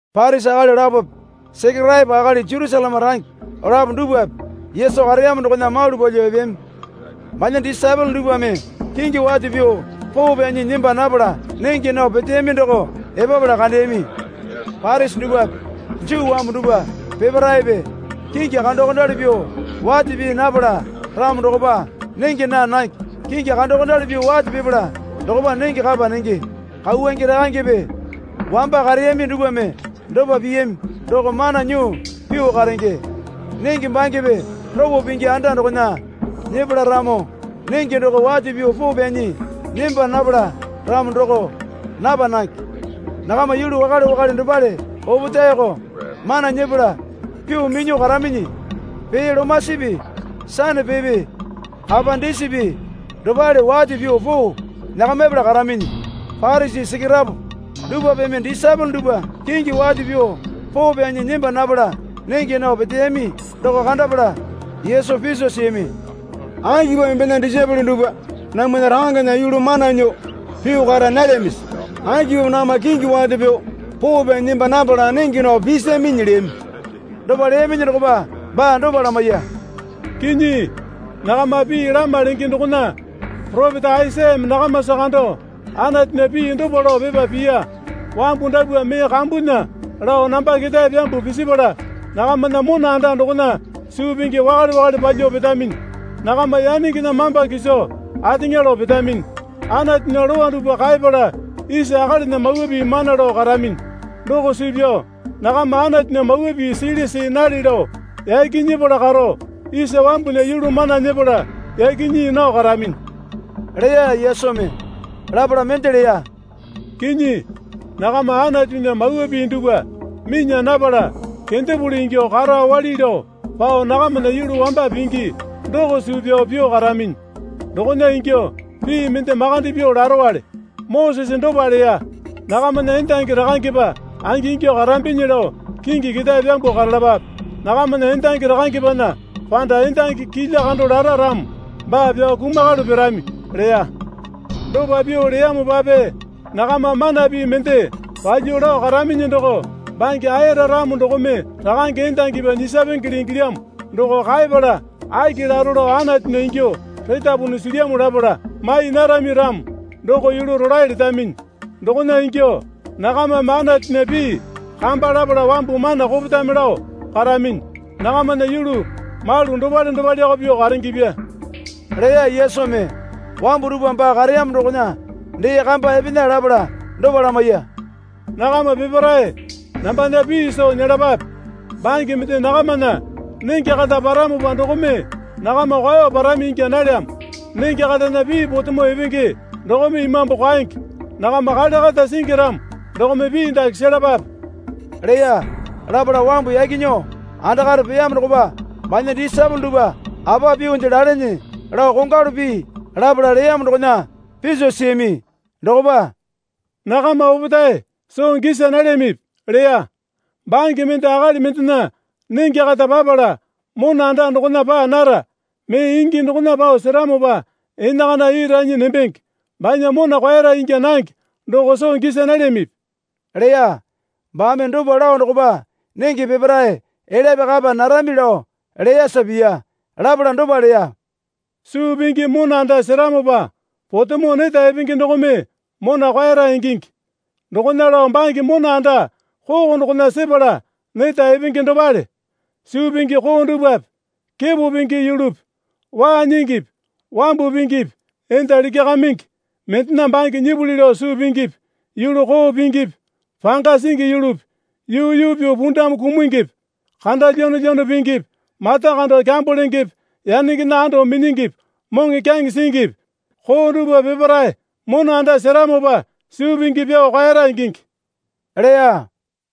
Parisi akali lapope Sekeraepo akali Jerusaleme range lapo dupwape Yesu kareyamo dokona malu palyuo epeyami. Banya disaepole dupwame kingi wate pyuo poo pyanyi nemba napala nenge nao peteyami doko epapala kandeyami. (Parisi dupwape Juu wambu dupwa peparaepe kingi kandokondali pyuo wate pii napala ramo dokopa nenge naa nange. Kingi kandokondali pyuo wate pipala dokopa nenge kapa nenge. Kauwange rakangepe wamba kareyami dupwame dopa piyami doko mana nyuo pyuo karenge. Nenge bangepe ropo pingi anda dokona nyepala ramo nenge doko wate pyuo poo pyanyi nemba napala ramo doko napa nange. Nakama yulu wakale wakale dopale opetaeko mana nyepala pyuo minyuo karaminyi. Pee lomasipi sanapepe kapa disipi dopale wate pyuo poo nyakamipala karaminyi.) Parisi Sekeraepo dupwapeme disaepole dupwa kingi wate pyuo poo pyanyi nemba napala nenge nao peteyami doko kandapala Yesu piso siyami. Akipamo embena disaepole dupwa namwana rakangena yulu mana nyuo pyuo kara nalyamisi? Akipamo nakama kingi wate pyuo poo pyanyi nemba napala nenge nao pisaminyi? leyami. Dopa leyaminyi dokopa baa dopa lamaiya. Kinyi, nakama pii lama lenge dokona poropeta Aisayame nakamasa kando Anatunya pii dopa lao pepa piya. Wambu dapwa mee kambunya lao namba ketae pyambuo pisipala, nakamana mona anda dokona suu pingi wakale wakale palyuo petaminyi. Nakama yanengena mamba kiso ateŋa lao petaminyi. Anatunya lowa dupwa kaeyapala isa akalinya mawa pii mana lao karaminyi. Doko suu pyao nakama Anatunya mawa pii sili see nale lao yaki nyepala karo isa wambunya yulu mana nyepala yaki nyii nao karaminyi, leya Yesumi. Lapala mende leya. Kinyi, nakama Anatunya mawa pii dupwa minya napala kendapuli ingyuo karo awali lao pao nakamana yulu wamba pingi doko suu pyao pyuo karaminyi. Dokona ingyuo pii mende makande pyuo larowale. Mosese dopa leya. Nakamana endangi rakangepa angingyuo karamibinyi lao kingi ketae pyambuo karalapape. Nakamana endangi rakangepana panda endangi kilya kando lara ramo baa pyao kumakalu pirami, leya. Dopa pyuo leyamopape nakama mana pii mende palyuo lao karaminyi doko bange ayara ramo dokome rakange endangipi nyisapengele ingilyamo doko kaepala aki laro lao Anatunya ingyuo retapunu silyamo lapala mai narami ramo doko yulu rolae letaminyi. Dokona ingyuo nakamame Anatunya pii kamba lapala wambu mana kopetame lao karaminyi. Nakamana yulu malu dopale dopaleko pyuo karengepya leya Yesumi. Wambu dupwa baa kareyamo dokona dee kamba epena lapala dopa lamaiya. Nakama peparae nambana pii soo nyelapape. Bange mende nakamana nenge kata paramopa dokome nakama kwao parami ingya nalyamo. Nenge katana pii potemo epenge dokome imambu kwaenge. Nakama kale kata singi ramo dokome pii dake selapape, leya. Lapala wambu yaki nyuo andakare peyamo dokopa banya disaepole dupwa apa pyuonde lalene lao kongwalu pii lapala leyamo dokona piso siyami. Dokopa, Nakama opetae soo gisa nalyamipi? leya. Bange mende akali mendena nenge kata papala, mona anda dokona paa nara. Mee ingi dokona pao seramopa enakana ii ranyi nembenge. Banya mona kwaera ingya nange doko soo gisa nalyamipi? leya. (Baame dopa lao dokopa nenge peparae elyape kapa narami lao leyasa piya.) Lapala dopa leya. Suu pingi mona anda seramopa potemo neta epenge dokome mona kwaera ingingi. Dokona lao bange mona anda koko dokona sepala neta epenge dopale. Suu pingi koo dupwape kepo pingi yulupi waa nyingipi wambu pingipi enda likyakamingi, mendena bange nyipuli lao suu pingipi yulu koo pingipi panga singi yulupi yuu yuu pyuo pundamu kumungipi kanda lyanolyano pingipi mata kando kyambo lengepe yanengena ando minyingipi moŋokyaŋe singipi, koo dupwa peparae mona anda seramopa suu pingi pyuo kwaera ingingi, leya.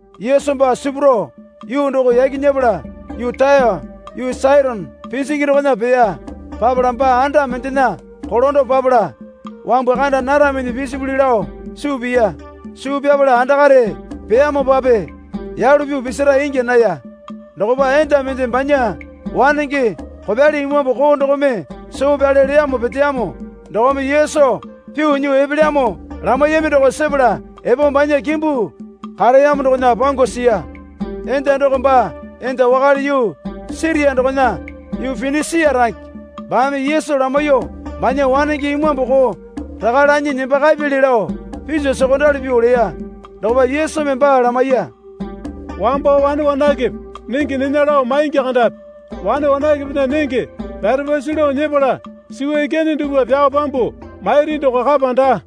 Yesu baa sipuro yuu doko yaki nyepala yuu Taya yuu Saitone pinjingi dokona peya. Papala baa anda mendena kolando papala wambu kanda naraminyi pisipuli lao suu piya. Suu pyapala andakare peyamopape yalu pyuo pisira ingya naya. Dokopa enda mende banya wanenge kopyali imambu koo dokome soo pyale leyamo peteyamo dokome Yesu pyuo nyuo epelyamo lamaiyami doko sepala epo banya kimbu kareyamo dokona pangu siya. Enda doko baa enda wakale yuu Siria dokona yuu Pinisia range. Baame Yesu lamaiyuo banya wanenge imambu koo raka lanyi nembakapyali lao piso sokondali pyuo leya. Dokopa Yesumi baa lamaiya. Wambo wane wanakepe nenge nena lao maingi kandapi. Wane wanakepena nenge pyarepasu lao nyepala suwa ikyane dupwa pyao pyambuo mairi doko kapa daa,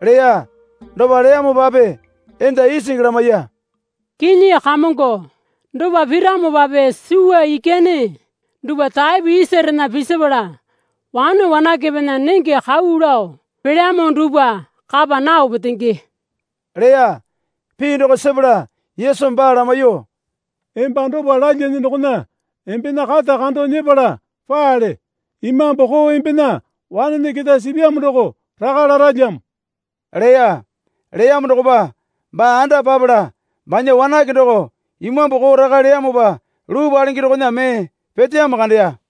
leya. Dopa leyamopape enda isingi lamaiya. Kinyi Kamongo, dopa piramopape suwa ikyane duwpa taepo isarena pisipala wane wanakepena nenge kau lao pelyamo dupwa kapa nao petenge, leya. Pii doko sepala Yesumi baa lamaiyuo, Emba dopa lalyane dokona embena kata kando nyepala paale. Imambu koo embena wanene keta sipyamo doko raka laralyamo, leya. Leyamo dokopa baa anda papala banya wanake doko imambu koo raka leyamopa luu palenge dokona mee peteyamo kandeya.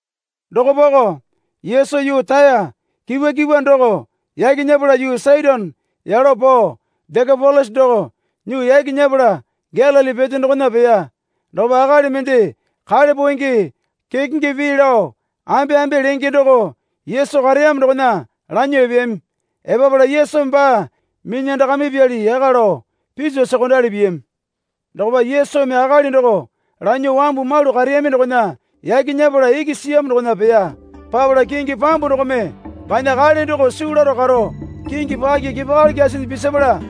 Dokopako Yesu yuu Taya kipwa kipwa doko yaki nyepala yuu Saitone yalo pao Dekapolisa doko nyuo yaki nyepala Galili pete dokona peya. Dokopa akali mende kale poenge kekenge pii lao ambeambe lenge doko Yesu kareyamo dokona lanyuo epeyami. Epapala Yesumi baa minyandakamipyali yaka lao piso sokondali piyami. Dokopa Yesumi akali doko lanyuo wambu malu kareyami dokona yaki nyepala iki siyamo dokona peya. Papala kingi pambu dokome banya kale doko suu laro karo kingi paki kepakali kyasinyi pisapala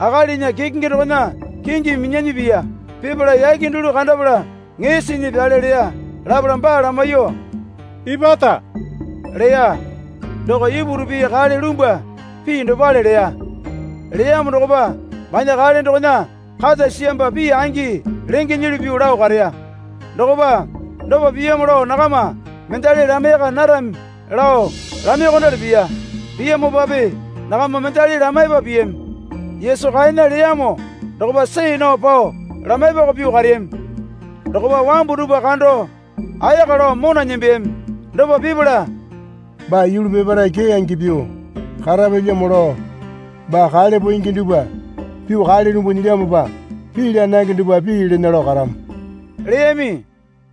akalinya kekenge dokona kingimi minyanyi piya. Pipala yake dulu kandapala ŋee sinyi pyale leya. Lapala baa lamaiyuo, Ipata, leya. (Doko Ipuru pii kale lumbwa pii dopale leya.) Leyamo dokopa banya kale dokona kata siyamopa pii angi lengenyili pyuo lao kareya. Dokopa, Dopa piyamo lao nakama mendali lamaiyaka narami, lao lamaiyuokondali piya. Piyamopape nakama mendali lamaipa piyami. Yesu kaena leyamo dokopa see nao pao lamaipako pyuo kareyami. Dokopa wambu dupwa kando ayaka lao mona nembeyami. Dopa pipala, Baa yulu peparae keyange pyuo karapyalyamo lao baa kale poenge dupwa pyuo kale lumbuo nyilyamopa, pii laa nange dupwa pii lena lao karamo, leyami.